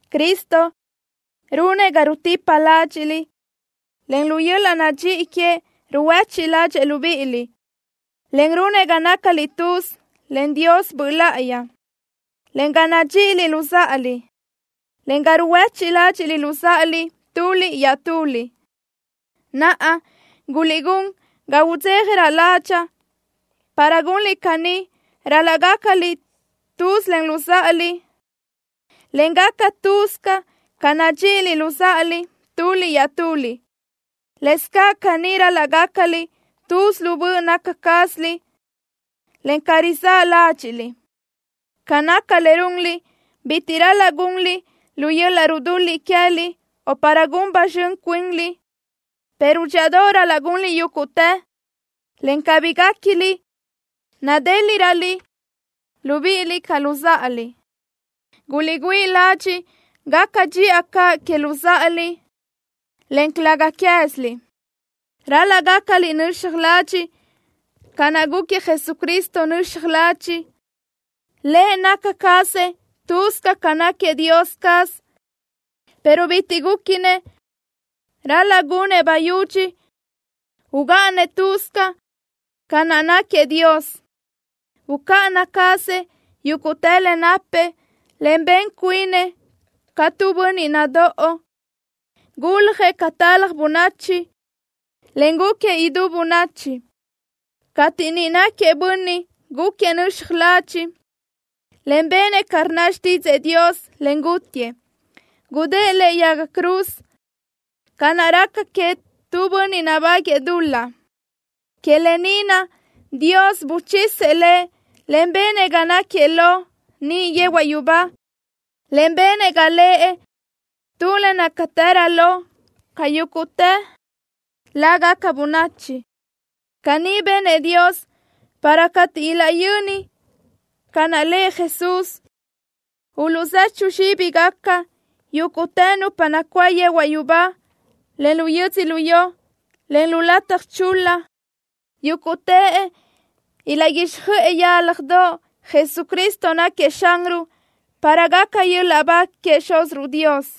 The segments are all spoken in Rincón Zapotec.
Cristo runëʼ ga rutipa ládxiʼliʼ, en lu yöl-laʼ nadxíʼi queëʼ ruhuéchiʼ ládxëʼë libíʼiliʼ, en runëʼ ga nácaliʼ tuz len Dios Böʼ Láʼayi, en ga nadxíʼiliʼ luzáʼaliʼ, en ga ruhuéchiʼ ládxiʼliʼ luzáʼaliʼ tuliʼ iaʼtuliʼ. Naʼa guliʼgún ga udzéjarö ládxaʼa. Para gunliʼ caní, ral-laʼ gácaliʼ tuz len luzáʼaliʼ, en gaca lë́bisö ca nadxíʼiliʼ luzáʼaliʼ tuliʼ iaʼtuliʼ. Lëscaʼ caní ral-laʼ gácaliʼ tuz lu böʼ naca cázaliʼ, en ca rizáʼ ládxiʼliʼ. Ca naca le runliʼ, bitiʼ bi ral-laʼ gunliʼ lu yöl-laʼ rudul-liʼ queë́liʼ, o para gun ba zxön cuinliʼ, pero dxíʼadoʼ ral-laʼ gunliʼ yúguʼtë, en cabí guéquiliʼ nadéliʼröliʼ libíʼiliʼ ca luzáʼaliʼ. Guliʼgüíʼ ladxiʼ gaca dxiʼa caʼ que luzáʼaliʼ, en calëga queë́ziliʼ. Ral-laʼ gácaliʼ nöxaj ladxiʼ ca naʼ gúquiëʼ Jesucristo nöxaj ladxiʼ. Lëʼ naca cazëʼ lë́bisö ca náquiëʼ Dios caz, pero bitiʼ gúquinëʼ ral-laʼ gunëʼ bayudxi ugáʼanëʼ lë́bisö ca naʼ náquiëʼ Dios. Bucáʼana cazëʼ yúguʼtë le napëʼ, en ben cuinëʼ ca tu bönniʼ nadóʼo. Guljëʼ ca talaj bönachi, en gúquiëʼ idú bönachi. Cateʼ niʼ náquiëʼ bönniʼ, gúquiëʼ nöxaj ladxiʼ, en benëʼ ca rnna xtídzëʼë Dios, en gútiëʼ. Gudë́ʼë lëʼe yaga cruz ca naʼ raca queëʼ nu bönniʼ nabáguëʼë dul-laʼ. Que lë ni naʼ Dios buchisëʼ Lëʼ, en benëʼ ga náquiëʼ lo niʼ yehuaʼ yubá, en benëʼ ga lëʼ tu le nácatërö lo ca yúguʼtë lágaca bönachi. Caní benëʼ Dios para cateʼ ilaʼyöni ca naʼ lëʼ Jesús, uluʼzechu zxíbigaca yúguʼtë nupa nacuáʼ yehuaʼ yubá, en lu yödzölió, en lu lataj chul-la. Yúguʼtëʼ ilaʼguíxjöʼë yálajdoʼ Jesucristo náquiëʼ Xanruʼ para gaca yöl-laʼ ba queëʼ Xúziruʼ Dios.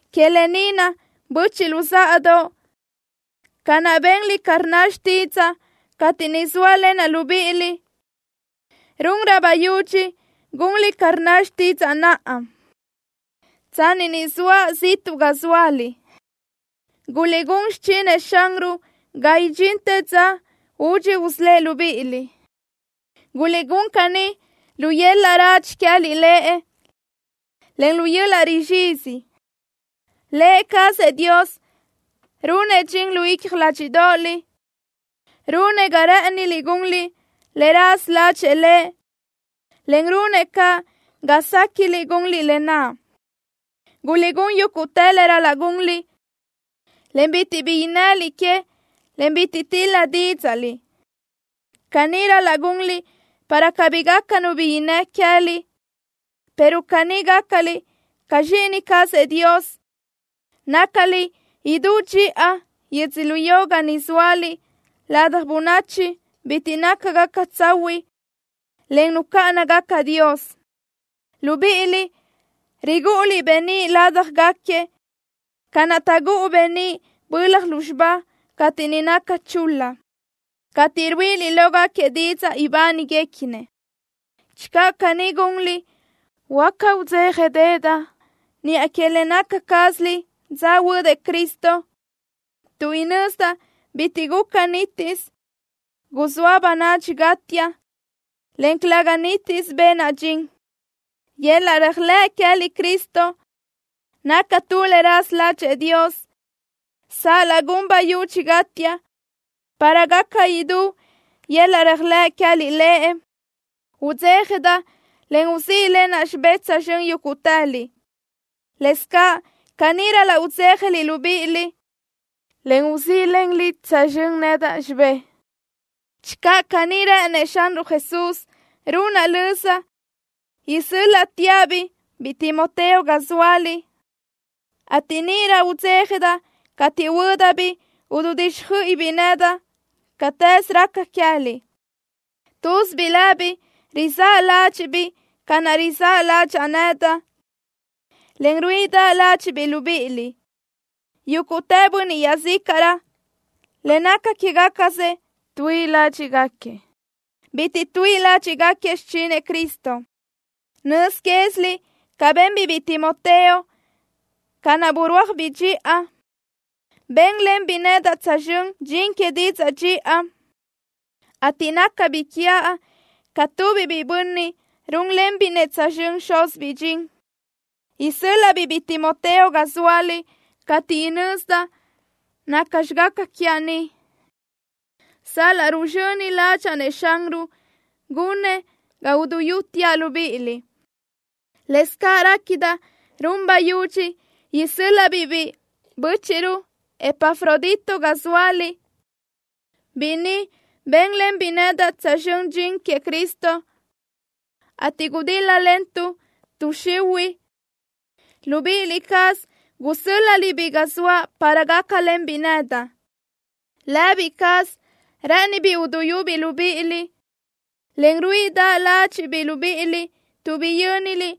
Que lë ni naʼ, böchiʼ luzáʼadoʼ, ca naʼ benliʼ ca rnna xtídzaʼa cateʼ niʼ zóalenaʼ libíʼiliʼ, runrö bayudxi gunliʼ ca rnna xtídzaʼa naʼa, tsanni ni zoaʼ ziʼtuʼ ga zóaliʼ. Guliʼgún xichinëʼ Xanruʼ ga idxintë dza údxi usölë́ʼ libíʼiliʼ. Guliʼgún caní lu yöl-laʼ radxi queë́liʼ Lëʼ, en lu yöl-laʼ rizxizi. Lë cazëʼ Dios runëʼ dxin lu icja ládxiʼdoʼoliʼ. Runëʼ ga rë́ʼëniliʼ gunliʼ le raza ládxëʼë Lëʼ, en runëʼ caʼ ga séquiʼliʼ gunliʼ lë naʼ. Guliʼgún yúguʼtë le ral-laʼ gunliʼ, en bitiʼ bi innëliʼ que, en bitiʼ til-la dídzaʼliʼ. Caní ral-laʼ gunliʼ, para cabí gaca nu bi innë́ queë́liʼ, pero caní gácaliʼ ca zxíʼini cazëʼ Dios, nácaliʼ idú dxiʼa yödzölió ga ni zóaliʼ ladaj bönachi bitiʼ nácagaca tsahuiʼ, en nucáʼanagaca Dios. Libíʼiliʼ rigúʼuliʼ beníʼ ládjagaquiëʼ ca naʼ taʼgúʼu beníʼ bölaj lúzxiba cateʼ ni naca chul-la, cateʼ ruíʼiliʼ lógaquiëʼ didzaʼ ibániguequinëʼ. Channö caní gunliʼ, huáca udzéjadeʼedaʼ niʼa que le naca cázaliʼ dza huödëʼ Cristo, tuʼ inözdaʼ bitiʼ guca nítisö guzóa bönadxi gátiaʼ, en calëga nítisö benaʼ dxin. Yöl-laʼ réajlëʼ queë́liʼ Cristo naca tu le raza ládxëʼë Dios. Sal-laʼ gun bayudxi gátiaʼ para gaca idú yöl-laʼ réajlëʼ queë́liʼ Lëʼ, udzéjadaʼ, en uzíʼlenaʼ xibé tsözxö́n yúguʼtëliʼ. Lëscaʼ caní ral-laʼ udzéjaliʼ libíʼiliʼ, en uzíʼlenliʼ tsözxö́n nedaʼ xibé. Channö caní rë́ʼënëʼ Xanruʼ Jesús, runaʼ löza isö́l-laʼteaʼ-biʼ biʼi Timoteo ga zóaliʼ, ateʼ níʼirö udzéjadaʼ cateʼ huö́dabiʼ ududíxjöiʼibiʼ nedaʼ cátëze raca queë́liʼ. Túzibiʼ lëbiʼ rizáʼ ládxiʼbiʼ ca naʼ rizáʼ ládxaʼa nedaʼ, en ruíʼidaʼ ládxiʼbiʼ libíʼiliʼ. Yúguʼtë bönniʼ iaʼzícaʼrö, le naca quégacasëʼ tuíʼi ládxiʼgaquiëʼ. Bitiʼ tuíʼi ládxiʼgaquiëʼ xichinëʼ Cristo. Nöz quéziliʼ ca benbiʼ biʼi Timoteo, ca naʼ burúajbiʼ dxiʼa. Bénlenbiʼ nedaʼ tsözxö́n dxin que didzaʼ dxiʼa, ateʼ nácabiʼ quiaʼ ca tubiʼ biʼi bönniʼ rúnlenbiʼ-nëʼ tsözxö́n xúzibiʼ dxin. Isö́l-laʼa-biʼ biʼi Timoteo ga zóaliʼ cateʼ inözdaʼ nacxi gaca quiaʼ ni sal-laʼ ruzxöni ládxaʼa-nëʼ Xanruʼ gunëʼ ga uduyúteaʼ libíʼiliʼ. Lëscaʼ réquidaʼ run bayudxi isö́l-laʼa-biʼ bíʼi bö́chiʼruʼ Epafrodito ga zóaliʼ. Biʼi ni bénlenbiʼ nedaʼ tsözxö́n dxin queëʼ Cristo, ateʼ gudíl-lalentuʼ tuʼ xihuiʼ. Libíʼi cázaliʼ gusö́l-laʼliʼ-biʼ ga zoaʼ para gácalenbiʼ nedaʼ. Lë cázabiʼ rë́ʼënibiʼ uduyúbiʼ libíʼiliʼ, en ruíʼidaʼ ládxiʼbiʼ libíʼiliʼ tuʼ biyö́niliʼ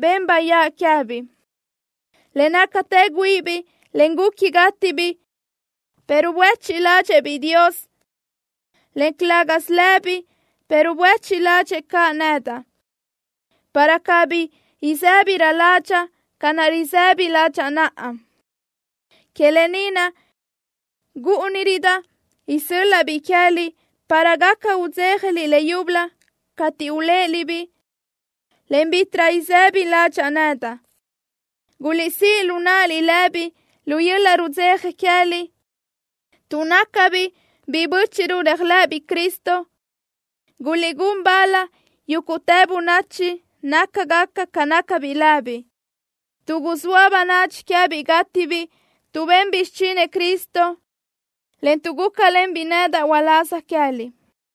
ben bayáʼ queë́biʼ. Le nácatë güíʼibiʼ, en guqui gátibiʼ, pero buéchiʼ ládxëʼë-biʼ Dios, en calë́gasö lëbiʼ, pero buéchiʼ ládxëʼë caʼ nedaʼ, para cabí isë́birö ládxaʼa ca naʼ risëbi ládxaʼa naʼa. Que lë ni naʼ, gúʼunirödaʼ isö́l-laʼa-biʼ queë́liʼ para gaca udzéjaliʼ leyúbölö cateʼ uléʼeliʼ-biʼ, en bítiʼrö isëbi ládxaʼa nedaʼ. Guliʼsíʼ lu náʼaliʼ lëbiʼ lu yöl-laʼ rudzeja queë́liʼ, tuʼ nácabiʼ biʼi bö́chiʼruʼ réajlëʼëbiʼ Cristo. Guliʼgún bal yúguʼtë bönachi nácagaca ca nácabiʼ lëbiʼ, tuʼ guzóa bönadxi queë́biʼ gátibiʼ tuʼ benbiʼ xichinëʼ Cristo, en tuʼ gúcalenbiʼ nedaʼ uláz queë́liʼ.